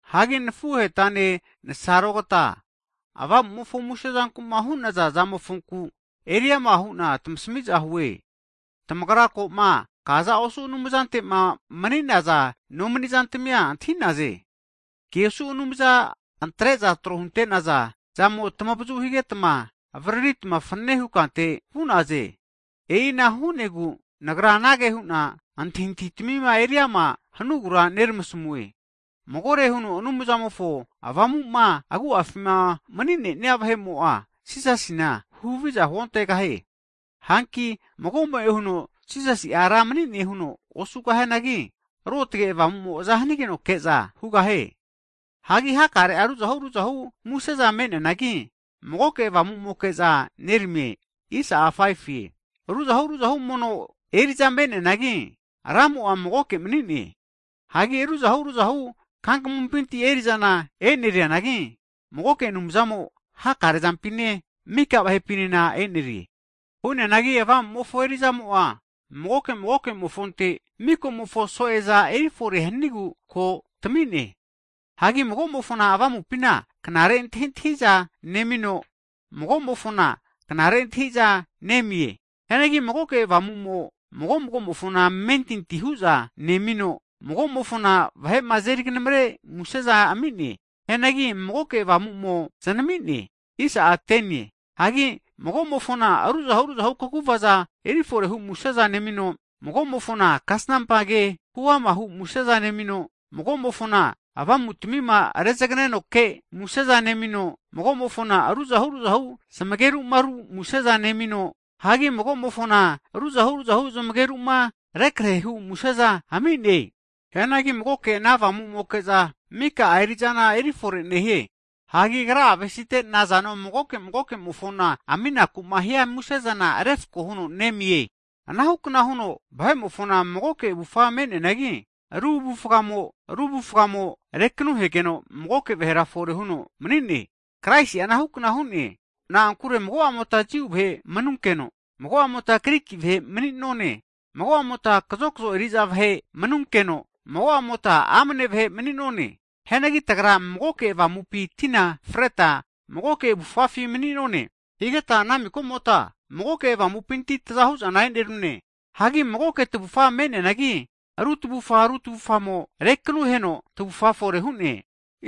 Hagi nafuhegatane nensarogata avamu'mofo muse zanku'ma hu'naza zamofonku eriama hu'na tmasami'za hue. Tamagra ko'ma kaza osu havige anumzante'ma mni'naza no mani'zantmia antahi'naze. Ke osu anumza antre'za tro hunte'naza zamo tmavazu higetma, avaririta fanane hukante vu'naze. E'ina hu'negu nagra anage hu'na antahintahima eriama hanugura neramasamue, magore huno Anumzamofo Avamu'ma agu'afima mni'ne'nia vahe'mo'a Jisasina huhaviza huontegahie. Hagi mago'mo'e huno Jisasi'a Ra mni'ne huno osugahianagi, Ruotge Avamu'mo aza hanigenoke'za hugahie. Hagi hakare'a ruzahu ruzahu museza me'neanagi, magoke Avamu'moke'za neramie. Ruzahu ruzahu mono eri'za me'neanagi, Ramo'a magoke mani'ne. Hagi ruzahu ruzahu kankamumpinti eri'zana e'nerianagi, magoke Anumzamo hakare zampine, mika vahepina e'nerie. Hu'neanagi Avamu'mofo eri'zamo'a magoke magoke'mofonte, mikomofo so'eza efore hanigu ko tami'ne. Hagi mago'mofona Avamupina knare antahintahiza (wisdom) nemino, mago'mofona ama' antahi'za (knowledge) nemie. Hianagi magoke Avamu'mo, mago'mofona amentinti hu'za nemino, mago'mofona vahe'ma azeri knamre museza ami'ne. Hianagi magoke Avamu'mo zanami'ne. Hagi mago'mofona ruzahu ruzahu kaguvaza eri fore hu museza nemino, mago'mofona kasnampa ke huamahu museza nemino, mago'mofona avamutmima rezagneno ke museza nemino, mago'mofona ruzahu ruzahu zmegeru'ma ru museza nemino, hagi mago'mofona ruzahu ruzahu zmageru'ma rukrehe hu museza ami'ne. Hianagi magoke ana Avamu'moke, mika'a eri'zana erifore nehie. Hagi agra'a avesite magoke magoke'mofona nazano aminaku'ma hia musezana refko huno nemie. Anahukna huno vahe'mofona magoke avufa me'neanagi, ru avufgamo ru avufgamo rekanuhegeno, magoke vahera fore huno mni'ne. Kraisi'a anahukna hu'ne. Na'ankure mago'amota Jiu vahe manunkeno, mago'amota Griki vahe mni'none. Mago'amota kazokzo eri'za vahe manunkeno, mago'amota amne vahe mni'none. Hianagi tagra magoke Avamupi tina freta, magoke avufafi mni'none. Ana higeta ana miko'mota magoke Avamupinti tazahu'zana e'nerune. Hagi magoke tavufa me'neanagi, ru tavufa ru tavufamo rekanuhegeno tavufa fore hu'ne.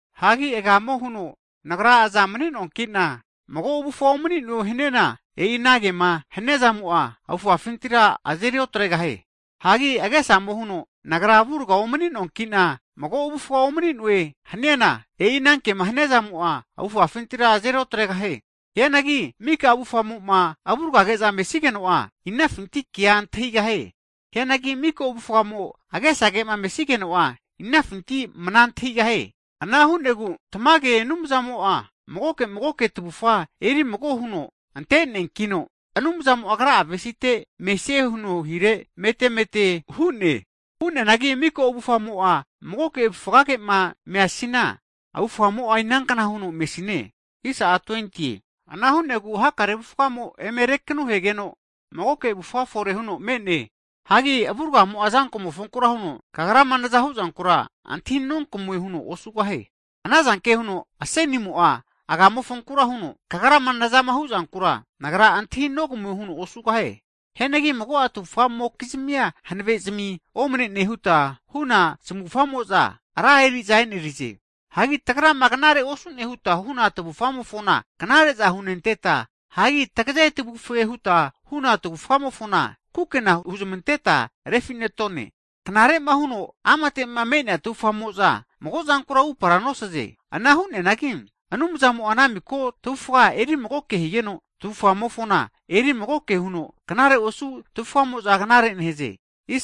Hagi agamo huno, nagra azana omni'noanki'na, mago avufa omni'noe haniana, e'i ana kema haniazamo'a, avufafintira azeri otregahie. Hagi agesamo huno, nagra avurga omninoanki'na, mago avufa omni'noe haniana, e'i ana kema haniazamo'a, avufafintira azeri otregahie. Hianagi mika avufamo'ma avurgage'za mesigeno'a, inafinti kea antahigahie? Hianagi mika avufamo agesage mesigeno'a, inafinti mna antahigahie? Ana hu'negu tamage Anumzamo'a, magoke magoke tavufa eri mago huno ante'neankino, Anumzamo agra'a avesite mesie huno hire mete mete hu'ne. Hu'neanagi mika avufamo magoke avufgage'ma mesiana, avufamo'a inankna huno mesine? Ana hu'negu hakare avufgamo eme rekanuhegeno, magoke avufa fore huno me'ne. Hagi avurgamo'a azamofonkura huno, kagrama nazama hu'zankura antahi nonkamue huno osugahie. Ananzanke huno asenimo'a agamofonkura huno, kagrama nazama huzankura, nagra antahi nogamue huno osugahie. Hianagi mago'a tavufamokizmia hanave zmi omne'ne huta huna zmufamo'za, ra eri'za e'nerize. Hagi tagrama knare osu'ne huta huna tavufamofona knare'za hunenteta, hagi tageze tavufe huta huna tavufamofona kukena huzmanteta refi'netone. Knare'ma huno amate me'nea tavufamo'za mago'zankura upara nosaze. Ana nehunanagi, Anumzamo'a ana miko tavufa eri magoke higeno, tavufamofona eri magoke huno knare osu tavufamo'za knare'za nehaze.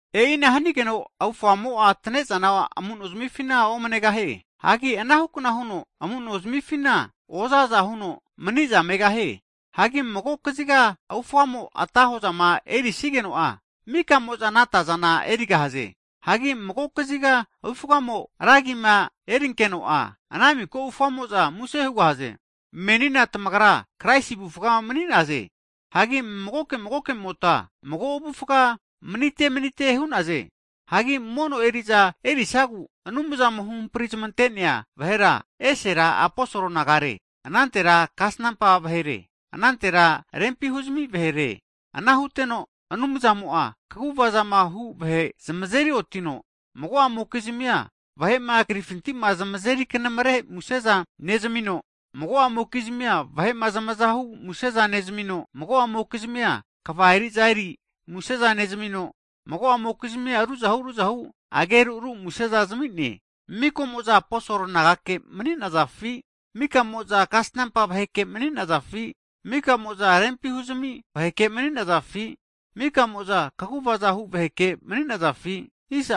E'ina hanigeno avufamo'a atne'za amu'nozmifina omnegahie. Hagi anahukna huno amu'no zmifina oza aza huno mani'za megahie. Hagi mago kaziga avufamo ata hozama eri sigeno'a, mika'mo'za ana atazana erigahaze. Hagi mago kaziga'a avufamo ra agima erinkeno'a, ana miko avufamo'za muse hugahaze. Menina tamagra Kraisi avufa mni'naze. Hagi magoke magoke'mota, mago avufga'a manite manite hu'naze. Hagi, mono eri'za erisagu Anumzamo huhamprizmante'nea vahera, esera aposol nagare, anantera kasanampa vahere, anantera rempi huzami vahere. Ana huteno Anumzamo'a kaguvazama hu vahe zmazeri otino, mago'amokizmia vahe'ma krifintima zmazeri kanamre muse'za nezamino, mago'amokizmia vahe'ma zamaza hu muse'za nezamino, mago'amokizmia kva eri'za eri muse'za nezamino, mago'amokizmia ruzahu ruzahu ageru ru muse'za zami'ne. Mika'mo'za aposol nagake mani'nazafi? Mika'mo'za kasanampa vaheke mani'nazafi? Mika'mo'za rempi huzami vaheke mani'nazafi? Mika'mo'za kaguvaza hu vaheke mani'nazafi?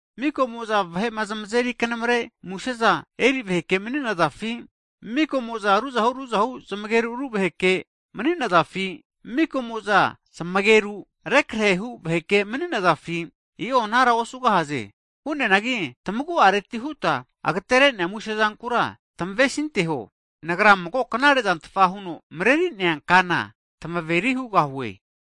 Mika'mo'za vahe'ma zmazeri knamre museza eri vaheke mani'nazafi? Mika'mo'za ruzahu, ruzahu zmageru, ru vaheke mani'nazafi? Mika'mo'za zmageru rekrehehu vaheke mani'nazafi? I'o anara osugahaze. Hu'neanagi tamagu'areti huta agetere'nea muse zankura tmavesinteho. Nagra mago knare'zantfa huno mreri'nea kana tamaveri hugahue.